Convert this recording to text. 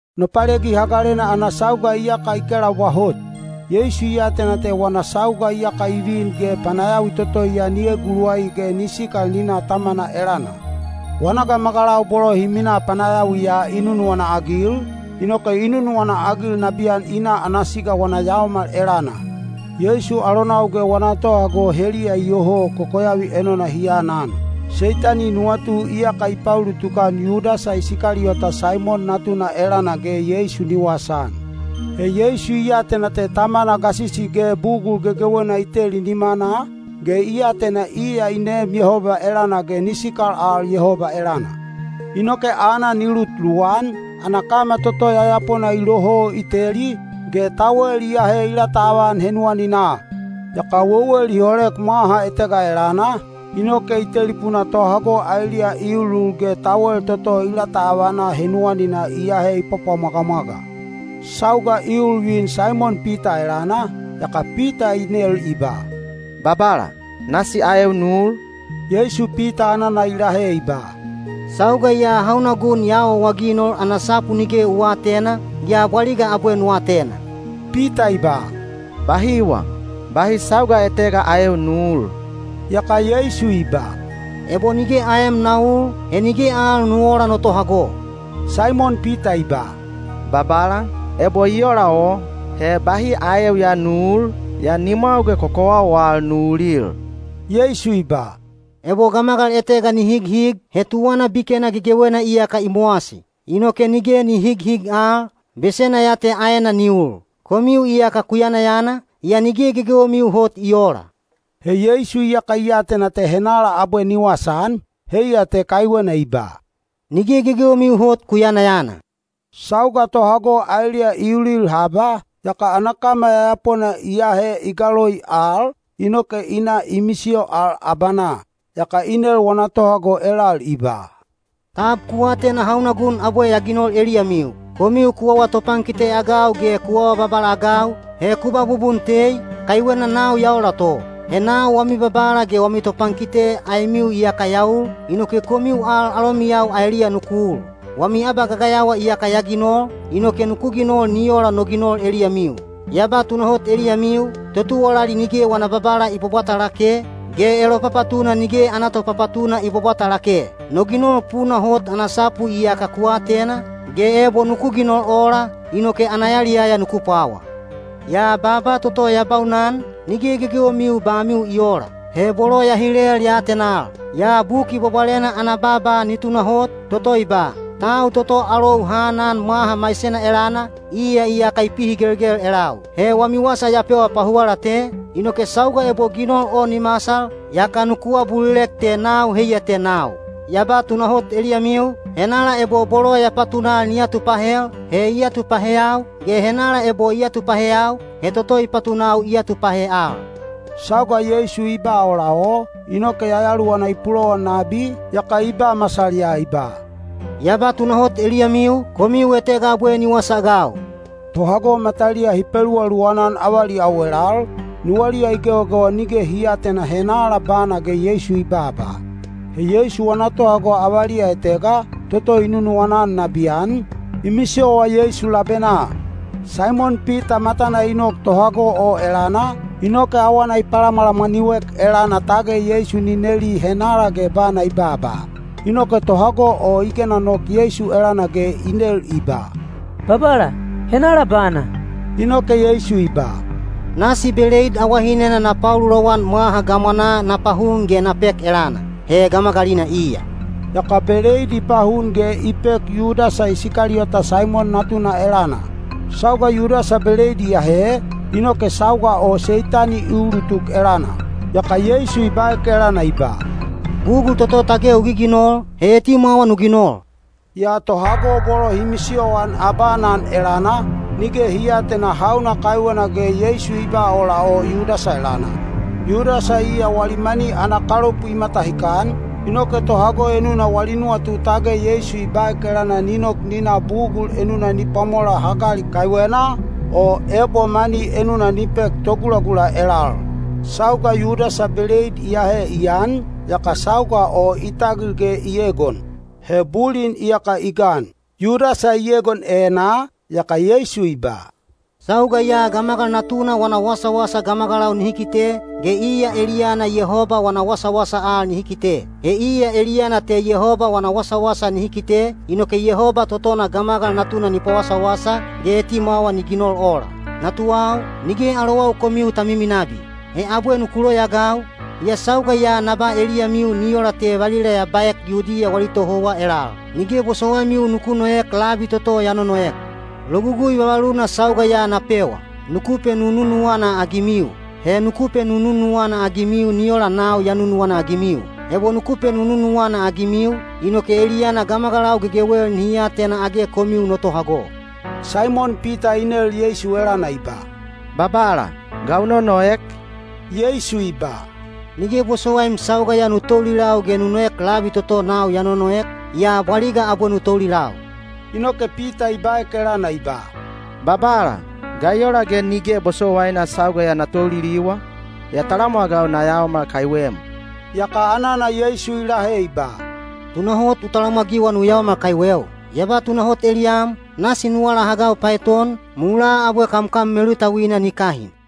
Nopalegi Hagalena ana sauga iyaka i kelaubwa hot. Yeisu i atena te wana sauga iyaka i vin ge panayawi toto ya ni eguluwai ge ni sikal ni na Tamana elana. Wana gamagalau bolo hi minaa panayawiya i nunuwana-agil, inoke i nunuwana-agil nabiyan i na ana siga wana yaomal elana. Yeisu alonau ge wana tohago heliya iyoho kokoyavi enona hi aanan. Seitani nuwatu iyaka i paulutuk-an Yudasa Isikaliyota Saimon natuna elana ge Yeisu ni wasaan. He Yeisu i atena te Tamana gasisi ge bugul gegewena i teli nimanaa, ge i atena iya i neem Yehoba elana ge ni sikal al Yehoba elana. Inoke aanan i lut luwan, ana kama toto yayapona i loho i teli, ge tawel i ahe i lataavan henuwaninaa. Yaka wewel i holek mwaha etega elana, inoke i telipuna tohago aeliya i ulul ge tawel toto i lataavana henuwaninaa i ahe i pwapwamwagamwaga. Sauga i ul vin Saimon Pita elana, yaka Pita i nel i ba, “Babala, nasi aeu nu ul?” Yeisu Pita anana i lahe i ba, “Sauga ya hauna gun ya awaawaginol ana sapu nige u aatena, yaa bwaliga abwe nu atena.” Pita i ba, “Bahiwa! Bahi sauga etega aeu nu uul.” Yaka Yeisu i ba, “Ebo nige aem na uul, he nige al nu oola no tohago.” Saimon Pita i ba, “Babala, ebo i ola o, he bahi aeu ya nu uul, yaa nimwau ge kokowau al nu ulil.” Yeisu i ba, “Ebo gamagal etega ni highig, he tuwana bikena gegewena iyaka i mowasi. Inoke nige ni highig al, besena ya te aena ni ul. Komiu iyaka ku yanayana, yaa nige gegewemiu hot i oola.” He Yeisu iyaka i atena te henala abwe ni wasaan, heiya te kaiwena i ba, “Nige gegewemiu hot ku yanayana.” Sauga tohago aeliya i ulil haba, yaka ana kama yayapona i ahe i galoi al, inoke i na i misiyo al abanaa. Yaka i nel wana tohago elal i ba, “Tab ku atena hauna gun abwe ya ginol eliyamiu? Komiu ku awa topankite-agau ge ku awa babala-agau, he ku ba bubun tei, kaiwena nau ya ola to. He nau wami Babala ge wami Topankite aemiu iyaka ya ul, inoke komiu al alomiyau aeliya nuku ul. Wami abagagayawa iyaka ya ginol, inoke nuku ginol ni ola no ginol eliyamiu. Ya ba tunahot eliyamiu, totuwalali nige wana babala i bwabwata lake, ge elopapatuna nige ana topapatuna i bwabwata lake. No ginol puna hot ana sapu iyaka ku atena, ge ebo nuku ginol ola, inoke ana yaliyaya nuku pwawa. Yaa baaba toto ya baunan, nige gegewemiu bamiu i oola. He bolo ya hilel ya atenal. Yaa Buki Bwabwalena ana baaba ni tunahot, toto i ba, ‘Tau toto alou ha anan mwaha maisena elana, iya iyaka i pihigelgel elau.’ He wami wasa ya pewa pahuwala te, inoke sauga ebo ginol o ni masal, yaka nuku abulilek te ‘Nau heiya te Nau.’ Ya ba tunahot eliyamiu, henala ebo bolo ya patunal ni atupahel, he i atupaheyau, ge henala ebo i atupaheyau, he toto i patunau i atupahe al.” Sauga Yeisu i ba ola o, inoke yayaluwana i pulowan nabi, yaka i ba masal ya i ba, “Ya ba tunahot eliyamiu, komiu etega abwe ni wasaagau.” Tohago mataliya hi peluwaluwan-an avaliyau elal, nuwaliya i gewagewa nige hi aatena henala bana ge Yeisu i babaa. He Yeisu wana tohago avaliya etega, toto i nunuwana-an nabiyan, i misiyowa Yeisu labenaa. Saimon Pita matana i nok tohago o elana, inoke awana i palamwalamwaniu-ek elana tage Yeisu ni neli henala ge bana i babaa. Inoke tohago o i gena nok Yeisu elana ge i nel i ba, “Babala, henala bana?” Inoke Yeisu i ba, “Nasi beleid awahinena na paululowan mwaha gamwanaa na pahun ge na pek elana. He gamagalina iya.” Yaka beleid i pahun ge i pek Yudasa Isikaliyota Saimon natuna elana. Sauga Yudasa beleid i ahe, inoke sauga o Seitani i ulutuk elana. Yaka Yeisu i baek elana i ba, “Bugul toto tage u giginol, he etimwawa nu ginol.” Yaa tohago bolo hi misiyoan abaanan elana, nige hi aatena hauna kaiwena ge Yeisu i ba ola o Yudasa elana. Yudasa iya wali mani ana kalopu i matahikan, inoke tohago enuna wali nuwatu tage Yeisu i baek elana ni nok ni na bugul enuna ni pwamola hagali kaiwena, o ebo mani enuna ni pek togulagula elal. Sauga Yudasa beleid i ahe i an, yaka sauga o i tagil ge i egon. He bulin iyaka i gan. Yudasa i egon enaa, yaka Yeisu i ba, “Sauga ya Gamagal Natuna wana wasawasa gamagalau nihi kite, ge iya eliyana Yehoba wana wasawasa al nihi kite. He iya eliyana te Yehoba wana wasawasa nihi kite, inoke Yehoba totona Gamagal Natuna ni pawasawasa, ge etimwawa ni ginol ola. “Natuwau, nige alowau komiu ta miminabi. He abwe nuku loyaagau, yaa sauga ya na ba eliyamiu ni ola te valila ya baek Yudiya wali tohouwa elal: ‘Nige bosowaimiu nuku noek labi toto ya nonoek.’ Logugui vavaluna sauga ya na pewa: nuku penununuwana-agimiu. He nuku penununuwana-agimiu ni ola nau ya nunuwana-agimiu. Ebo nuku penununuwana-agimiu, inoke eliyana gamagalau gegewel nihi atena age komiu no tohago.” Saimon Pita i nel Yeisu elana i ba, “Babala, ga u nonoek?” Yeisu i ba, “Nige bosowaim sauga ya nu toulilau ge nu noek labi toto nau ya nonoek, yaa bwaliga abwe nu toulilau.” Inoke Pita i baek elana i ba, “Babala, ga i ola ge nige bosowaina sauga ya na touliliwa? Ya talamwagau na yaomal kaiwem.” Yaka anana Yeisu i lahe i ba, “Tunahot u talamwagiwa nu yaomal kaiweu? Ya ba tunahot eliyam, nasi nu alahagau paeton, mulaa abwe kamkam melutauina ni kahin.”